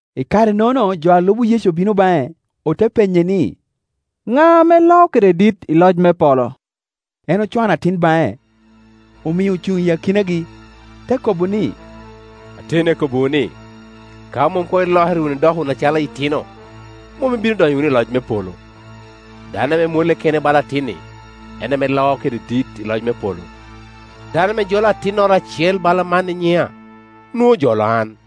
I kare-nono jo a lubo Yecu obino baŋe, ote penye ni, “Ŋa ame loo kede dit i loc me polo?” En ocwano atin baŋe, omio ocuŋ i akinagi, te kobo ni, “Ateni akobbiwu ni, ka mom koŋ ilokere wunu, idoko wunu acalo itino, mom ibino donyo wunu i loc me polo. Dano ame mwolle kene bala atin-ni en ame loo kede dit i loc me polo. Dano ame jolo atinnoro acel bala man i nyiŋa, nwoŋo ojolo an.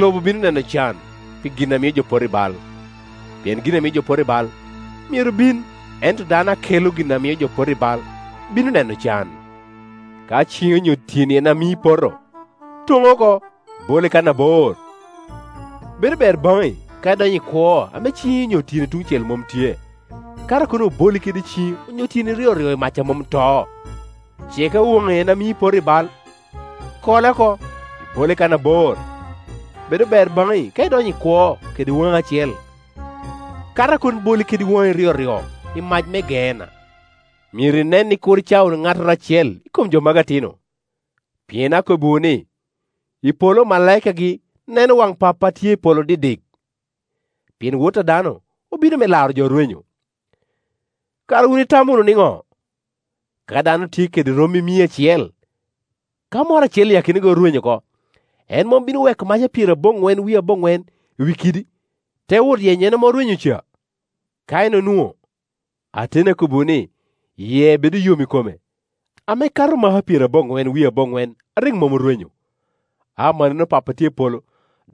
“Lobo bino neno can pi gin a mio jo poto i bal. Pien gin a mio jo poto i bal myero bin, ento dano a kela gin a mio jo poto, bino neno can! Ka ciŋi onyo tyeni en a mii ipoto, toŋ oko, ibole kan abor; bedo ber baŋi ka idonyo i kwo ame ciŋi onyo tyeni tuŋ cel mom tye, kato a kono oboli kede ciŋi onyo tyeni tyoryo i mac a mom to. Ce ka waŋi en a mii ipoto, kole oko, ibole kan abor; bedo ber baŋi ka idonyo i kwo kede waŋi acel, kato a kono boli kede waŋi ryoryo i mac me Geena. “Myero inen ni kur icao wunu ŋattoro acel i kom jo magi atino; pien akobbiwu ni, i polo omalaikagi neno waŋ Pappa a tye i polo didik. [ Pien Wot a dano obino me laro jo orwenyo.] Kara wun itamo wunu niŋo? Ka dano tye kede rommi mere mia acel, ka moro acel i akinagi orwenyo oko, en mom bino weko maka pyeraboŋwen wie aboŋwen i wi kidi, te wot yenyo en ame orwenyo ca? Ka en onwoŋo, ateni akobbiwu ni, yie bedo yom i kome, ame kato maka pyeraboŋwen wie aboŋwen a rik mom orwenyo. Amannono Pappa a tye i polo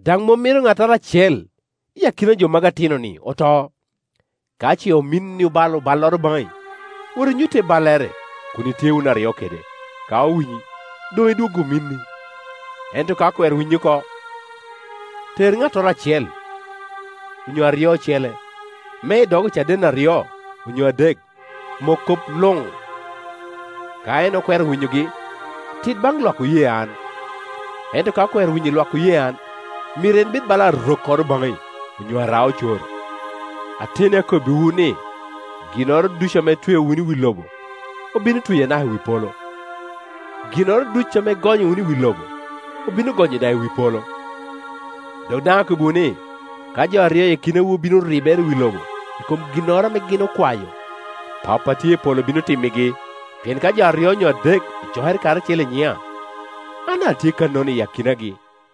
daŋ mom mito ŋattoro acel i akina jo magi atino-ni oto. “Ka ce ominni obalo balloro baŋi, wot inyutte ballere kun itye wun aryo kede. Ka owinyi, doŋ idwoggo ominni. Ento ka okwero winyi oko, ter ŋattoro acel onyo aryo ocele, me i dog ocaden aryo onyo adek mok kop luŋ. Ka en okwero winyogi, tit baŋ lwak oye an; ento ka okwero winyo lwak oye an, myero en bed bala arokkoro baŋi onyo ara-ocoro. “Ateni akobbiwu ni, ginnoro ducu ame itweo wunu i wi lobo obino tweyo anaka i wi polo, ginnoro ducu ame igonyo wunu i wi lobo obino gonyo daŋ i wi polo. Dok daŋ akobbiwu ni, ka jo aryo i akinawu bino ribere i wi lobo i kom ginnoro ame gin okwayo, Pappa a tye i polo bino timmigi. Pien ka jo aryo onyo adek ocokere karacel i nyiŋa, an daŋ atye kannono i akinagi.”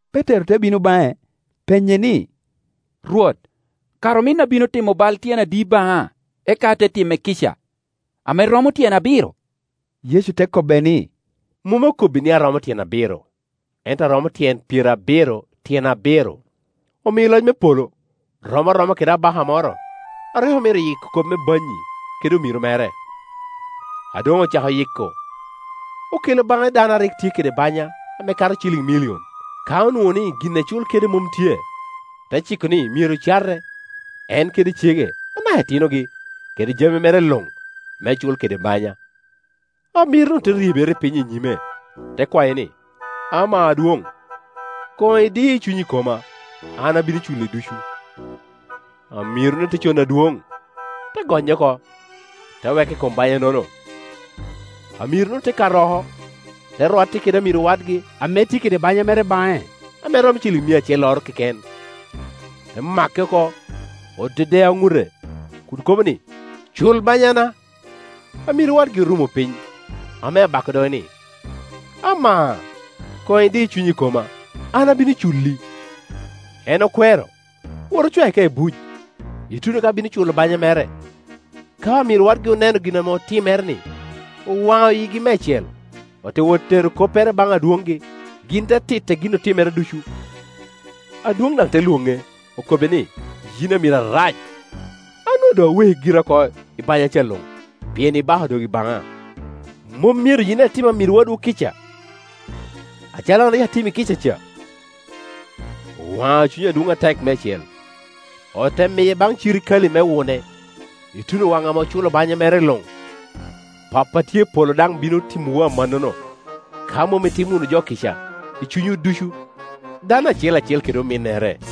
Petero te bino baŋe, penye ni, “Rwot, kara ominna bino timo bal tyen adi baŋa eka ate time kica? Ame romo tyen abiro?” Yecu te kobbe ni, “Mom akobbi ni a romo tyen abiro, ento a romo tyen pyerabiro tyen abiro. “Omio loc me polo rom aroma kede abaka moro a rik omito yiko kop me banyi kede omiro mere. A doŋ ocako yiko, okelo baŋe dano a rik tye kede banya ame kato ciliŋ milion. Ka onwoŋo ni gin ecul kede mom tye, te ciko ni myero cate, en kede cege anaka itinogi, kede jami mere luŋ, me cul kede banya. Amiro-nu te ryebere piny i nyime, te kwaye ni, ‘Ama adwoŋ, koŋ idii cunyi i koma, an abino culli ducu.’ Amiro-nu te cono adwoŋ, te gonye oko, te weke i kom banya-nono. Amiro-nu te kato oko, te rwatte kede amiro wadgi ame tye kede banya mere baŋe ame romo mia acelloro keken; te make oko, odedeo ŋute kun kobo ni, ‘Cul banyana!’ Amiro wadgi orumo piny ame bako doge ni, ‘Ama, koŋ idi cunyi i koma, an abino culli.’ En okwero; owoto ocwae ka i buc, ituno ka bino culo banya mere. Ka omiro wadgi oneno gin otimere-ni, owaŋo yigi meicel, ote wot tero koppere baŋ adwoŋgi, gin te titte gin otimere ducu. Adwoŋ daŋ te lwoŋe, okobbe ni, ‘Yin amiro arac! An onwoŋo doŋ aweki gira oko i banya ca luŋ pien ibako dogi baŋa. Mom myero yin daŋ itim amiro wadwu ikca, acalo an rik atimi kica ca?’ Owaŋo cuny adwoŋ atek meicel; ote miye baŋ cirikale me wune ituno waŋ ame oculo banya mere luŋ. Pappa a tye i polo daŋ bino timowu amannono, ka mom itimo wunu jo kica i cunywu ducu, dano acel acel kede ominnere.”